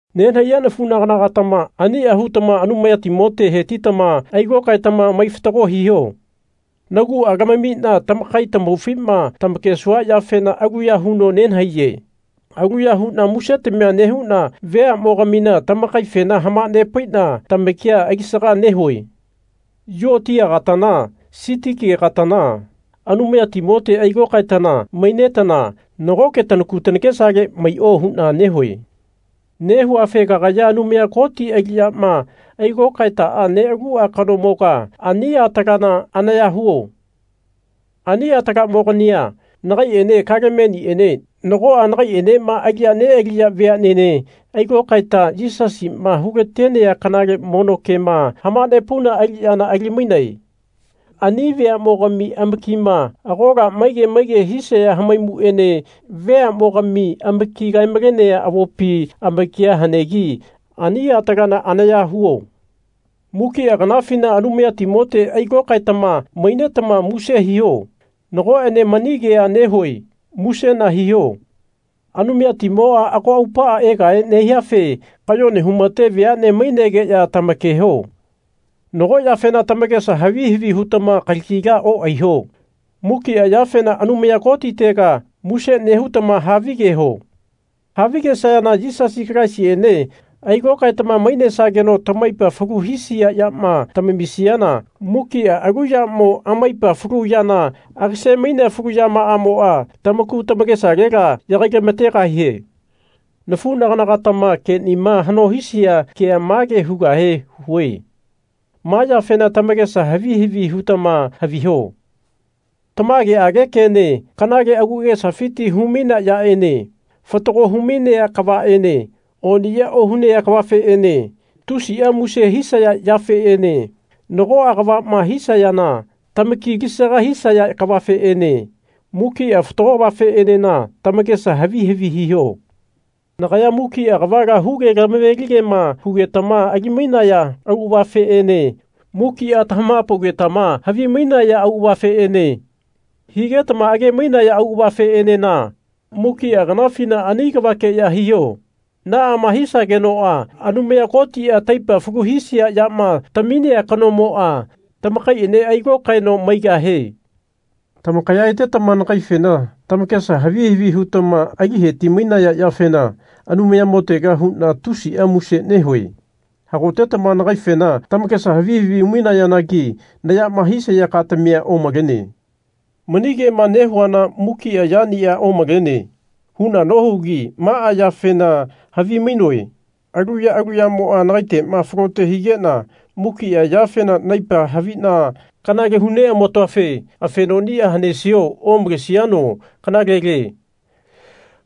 Nenahaiya nafunagana-gatama ania hutama Anumayatimote hetitama ailokaetama mai fatago hiho. Nagua lamamina tamakai tamaufima tamakesua yafena aluya huno nenahaiye. Aluya huna musetamia nehuna veamogamina tamakaifena hamanepaina tamakia alisaga nehue. Yuotiagatana Sitikegatana Anumayatimote ailokaetana mainetana nagoke tanaku tanakesale maio huna nehue. Nehuafe kagaya Anumaya Koti aliyama ailokaetaa nealua kanomoga ani atalana anaya huo. Ani atalamogania nagaiene Kalemeniene nagoa nagaienema aliya nealiya veanene ailokaeta Yisasima hulatenea kanale mono kema hamanepauna aliyana ali-mainae. Ani veamogami amakima agola maige maige hisaya hamaimuene veamogami amaki kae-malenea avopi amakia hanegi ani atalana anaya huo. Mukia kanafina Anumayatimote ailokaetama mainetama muse hiho. Nagoene mani kea nehue musena hiho. Anumayatimoa ago aupaa egahe nehiafe kayone humate veane mainegeya tamakeho. Nago yafena tamakesa havi havi hutama kalagila oaiho. Muki yafena Anumaya Kotitega muse nehutama havigeho. Havigesayana Yisasi Kalaisiene ailokaetama mainesageno tamaipa falu hisia yama tamamisiana mukia alu yamo amaipa falu yana agase-mainea falu yamaamoa tamaku tamakesalela yagailamategahie. Nafunagana-gatama kenima hano hisia kea mage hugahe hue. Ma yafena tamakesa havi havi hutama haviho, tamageage kene, kanale agu agesafiti humainea yaene, fatago humainea kavaene, oniya ohunea kavafeene, tusia muse hisaya yafeene, nagoa kavama hisayana tamaki alisaga hisaya kavafeene, mukia fatago kavafeenena tamakesa havi havi hiho. Nagaya mukia kavala huge tamave-ligema hugetama ali-mainaya auavafeene mukia tamahapaugetama havimainaya auavafeene, higetama age-mainaya auavafeenena mukia kanafina ani kavakeya hiho. Naama hisagenoa Anumaya Kotia taipa falu hisia yama taminea kanomoa tamakaiene ailokaeno maigahie. Tamakaya etetama nagaifena tamakesa havi havi hutama ali heti-mainaya yafena Anumayamotega huna tusia muse nehue. Hagotetama nagaifena tamakesa havi havi hu-mainayanagi nayama hisaya katamia omalene. Mani kema nehuana Mukia yania omalene. huna nohugi maa yafena havimainoe alu ya alu yamoa nagaitema falote higena mukia yafena naipa havina kanale huneamatoafe afenonia hanesiano omalesiano kanalele.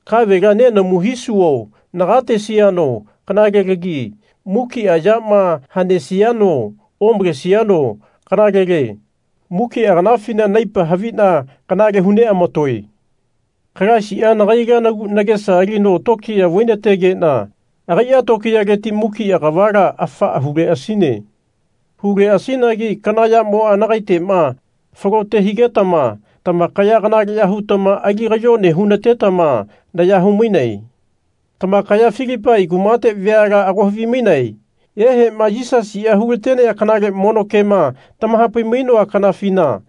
Kavela nenamu hisuo nagatesiano kanalelagi. Mukia yama hanesiano omalesiano kanalele. Mukia kanafina naipa havina kanale huneamatoe. Kalaisia nagaila nagu nagesa alino tokiya vainategena agaia tokiyaleti mukia kavala afaa huleasine. Huleasinagi kana yamoa nagaitema falote higetama tamakaya kanaleya hutama ali kayone hunatetama naya humainae. Tamakaya Filipai kumate veala ago havimainae ehema Yisasia hulatenea kanale mono kema tamahapai-mainoa kanafina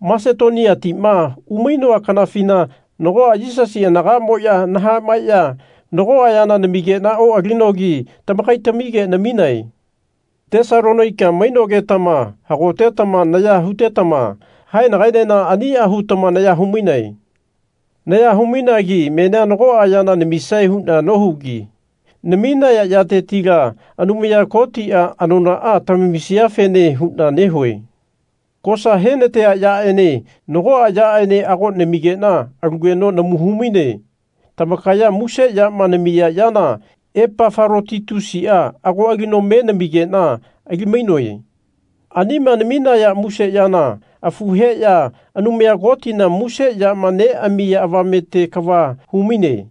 Masetoniatima umainoa kanafina nagoa Yisasi anagamoya nahamaeya nagoa yana namigena oalinogi tamakaitamige naminae. Tesalonaika mainogetama hagotetama naya hutetama haenagaenena ania hutama naya humainae. Naya humainagi menia nagoa yana namisae huna nohugi naminaya yatetila Anumaya Kotia anonaa tamamisiafene huna nehue. Kosa henatea yaene nagoa yaene ago namigena alugeno namu humaine. Tamakaya muse yama namiya yana Epafalotitusia ago alino me namigena ali-mainoe. Anima naminaya muse yana afu heya Anumaya Kotina muse yama neamiya avamete kava humainie.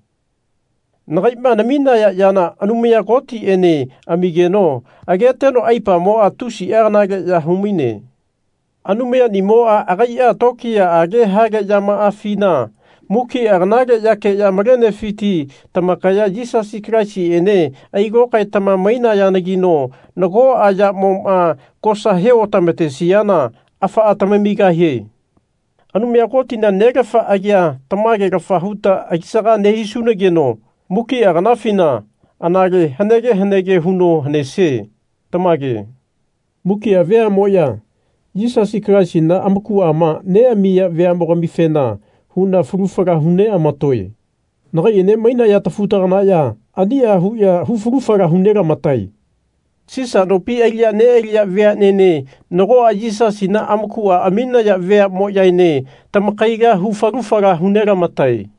Nagaima namiya yana Anumaya Kotiene amigeno ageteno aipamoa tusia kanaleya humaine. Anumayanimoa agaia tokiyaage hale yamaafina mukia kanale yakeya malenefiti tamakaya Yisasi Kalaisiene ailokaetama mainayanagino nagoa yamoma kosa he otamatesiana afaa tamamigahie. Anumaya Kotina Nelafa agia tamagelafa huta alisaga nehisunageno mukia kanafina anale hanege hanege huno hanesie. Tamage. Mukia veamoya, Yisasi Kalaisina amakuama neamiya veamogamifena huna falu fala hu neamatoe. Nagaiene mainaya tafu-taganaya ania huya hu falu fala hu nelamatae. Sisa nopi aliya nealiya veanene nagoa Yisasina amakua aminaya veamoyaene tamakaila hu falu fala hu nelamatae.